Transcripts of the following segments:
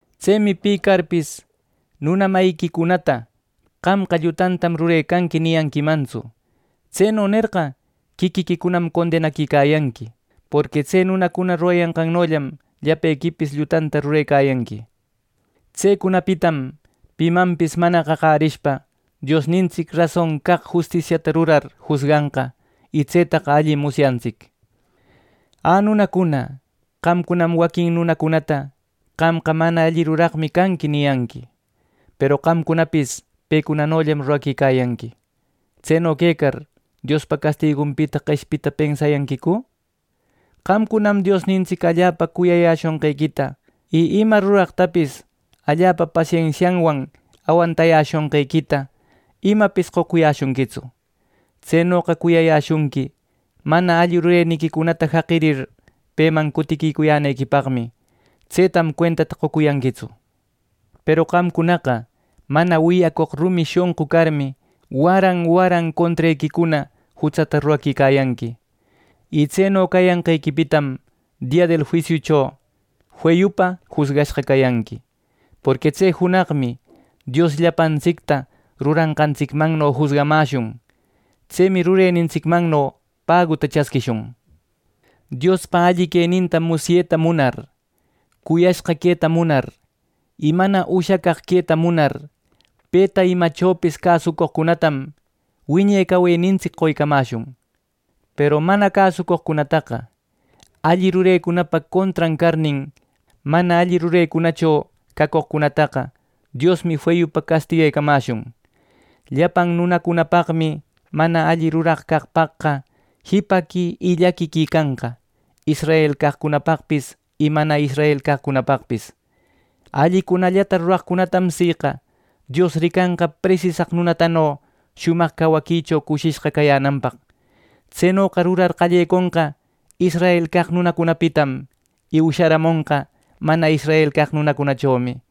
Tsemi pi carpis nuna mayiquicunata “Qamqa llutantam rurecanqui” niyanquimantsu. Tseno nerqa, quiquiquicunam condenaquicayanqui. Porqui tse nunacuna rurayanqannollam llapequipis llutanta rurecayanqui. Tsecunapitam pimanpis mana qaqärishpa Diosnintsic rason caq justisianta rurar jusganqa y tsetaqa allim musyantsic. ¡Ä, nunacuna, qamcunam waquin nunacunata “Qamqa mana alli ruraqmi canqui” niyanqui, peru qamcunapis pecunanollam rurecayanqui! Tseno quecar ¿Diospa castigunpita qeshpita pensayanquicu! ¡Qamcunam Diosnintsic allapa cuyayäshonqequita y ima ruraqtapis allapa pasensianwan awantayäshonqequita, imapis qocuyäshunquitsu! Tsenoqa cuyayäshunqui mana alli rureniquicunata jaqirir, peman cutiquicuyänequipaqmi. ¡Tsetam cuentata qocuyanquitsu! Peru qamcunaqa mana wiyacoq rumi shonqu carmi, waran waran contrequicuna jutsata ruraquicayanqui. Y tseno cayanqequipitam dia del juisiucho feyupa jusgashqa cayanqui; porqui tse junaqmi Dios llapantsicta rurashqantsicmanno jusgamäshun. Tsemi “Rurenintsicmanno paguta chasquishun.” Diospa alli queninta musyeta munar, cuyashqa queta munar y mana ushacaq queta munar, peta imachopis cäsucoqcunatam wiñe cawenintsic qoycamäshun. Peru mana cäsucoqcunataqa alli rurecunapa contran carnin, mana alli rurecunallacho cacoqcunataqa, Diosmi feyupa castiguecamäshun. Llapan nunacunapaqmi mana alli ruraq caqpaqqa jipaqui y llaquiqui canqa, israel caqcunapaqpis y mana israel caqcunapaqpis. Allicunallata ruraqcunatam siqa Dios ricanqa presisaq nunatano shumaq cawaquicho cushishqa cayänanpaq. Tsenoqa rurar qalleconqa israel caq nunacunapitam, y usharamonqa mana israel caq nunacunachomi.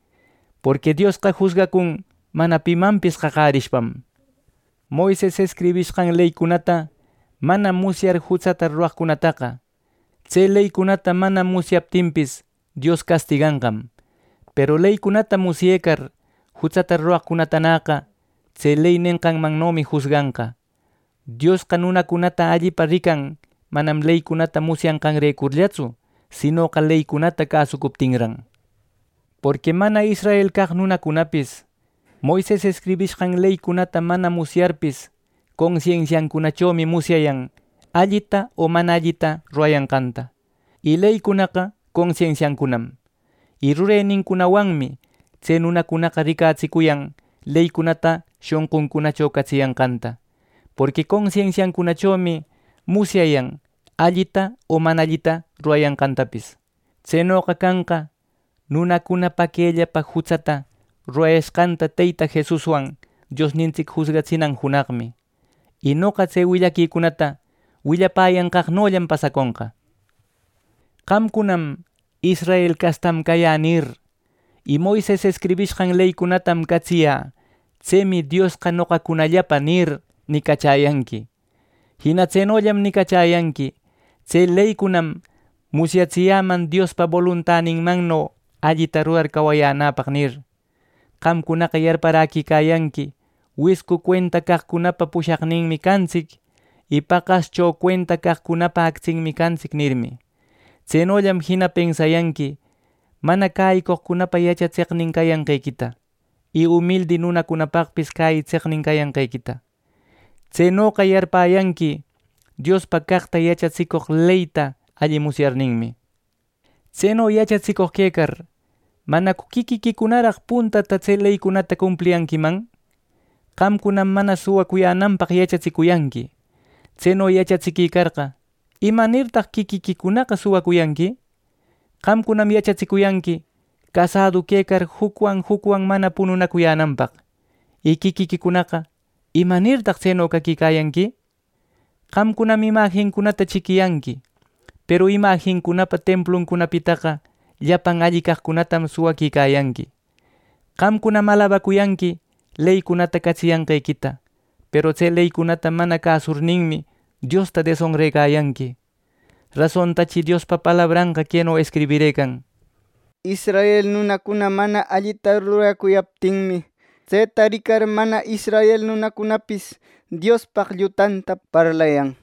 Porqui Diosqa jusgacun mana pimanpis qaqärishpam. Moises escribishqan leycunata mana musyar jutsata ruraqcunataqa tse leycunata mana musyaptinpis, Dios castiganqam. Peru leycunata musyecar jutsata ruraqcunataqa tse ley nenqanmannomi jusganqa. Diosqa nunata allipa rican, manam leycunata musyanqanrecurllatsu, sinoqa leycunata cäsucuptinran. Porqui mana israel caq nunacunapis Moises escribishqan leycunata mana musyarpis, consensiancunachomi musyayan allita o mana allita rurayanqanta. Y leynincunaqa consensiancunam. Y rurenincunawanmi tse nunacunaqa ricatsicuyan leycunata shonquncunacho catsiyanqanta. Porqui consensiancunachomi musyayan allita o mana allita rurayanqantapis. Tsenoqa canqa, nunacuna paquellapa jutsata rurayashqanta Teyta Jesuswan Diosnintsic jusgatsinan junaqmi, y noqa tse willaquicunata willapäyanqaqnollam pasaconqa. Qamcunam “Israel castam cayä” nir, y “Moises escribishqan leycunatam catsiyä, tsemi Diosqa noqacunallapa” nir, nicachäyanqui. Jina tsenollam nicachayanqui, “Tse leycunam musyatsiyäman Diospa boluntaninmanno allita rurar cawacuyänäpaq” nir. Qamcunaqa yarparäquicayanqui “Wiscu cuenta caqcunapa pushaqninmi cantsic” y “Paqascho cuenta caqcunapa actsinmi cantsic” nirmi. Tsenollam jina pensayanqui mana cäyicoqcunapa yachatseqnin cayanqequita, y umildi nunacunapapis cäyitseqnin cayanqequita. Tsenoqa yarpäyanqui rasonpa caqllata yachatsicoq leyta alli musyarninmi. Tseno yachatsicoq quecar ¿manacu quiquiquicunaraq puntata tse leycunata cumpliyanquiman! Qamcunam mana suwacuyänanpaq yachatsicuyanqui. Tseno yachatsiquicarqa, ¿imanirtaq quiquiquicunaqa suwacuyanqui! Qamcunam yachatsicuyanqui casädu quecar jucwan jucwan mana pununacuyänanpaq. Y quiquiquicunaqa, ¿Imanirtaq tseno caquicayanqui? Qamcunam imajincunata chiquiyanqui, ¡peru imajincunapa templuncunapitaqa llapan alli caqcunatam suwaquicayanqui! Qamcunam alabacuyanqui leycunata catsiyanqequita, peru tse leycunata mana cäsurninmi, Diosta desonrecayanqui. Rasontachi Diospa palabranqa queno escribirëcan: “Israel nunacuna mana allita ruracuyaptinmi, tseta ricar, mana israel nunacunapis Diospaq llutanta parlayan” nir.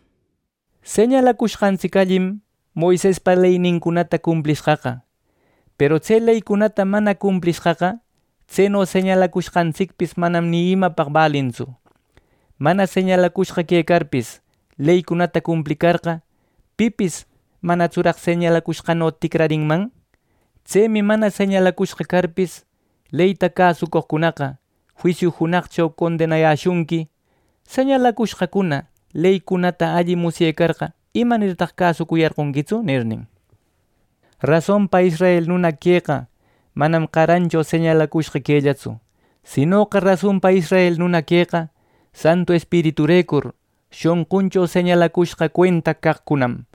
Señalacushqantsic allim, Moisespa leycunata cumplishqaqa; peru tse leycunata mana cumplishqaqa tseno señalacushqantsicpis manam ni imapaq balintsu. Mana señalacushqa quecarpis leycunata cumplicarqa, pipis ¿manatsuraq señalacushqanno ticrarinman? Tsemi mana señalacushqa carpis leyta cäsucoqcunaqa juisiu junaqcho condenayäshunqui: “Señalacushqacuna, leycunata alli musyecarqa, ¿imanirtaq cäsucuyarqonquitsu!” nirnin. Rasonpa israel nuna queqa manam qarancho señalacushqa quellatsu. Sinoqa rasonpa israel nuna queqa, Santu Espiriturecur shonquncho señalacushqa cuenta caqcunam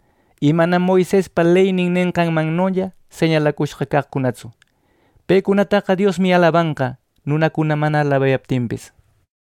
y manam Moisespa ley nenqanmannolla señalacushqa caqcunatsu. Pecunataqa Diosmi alabanqa, nunacuna mana alabaptinpis.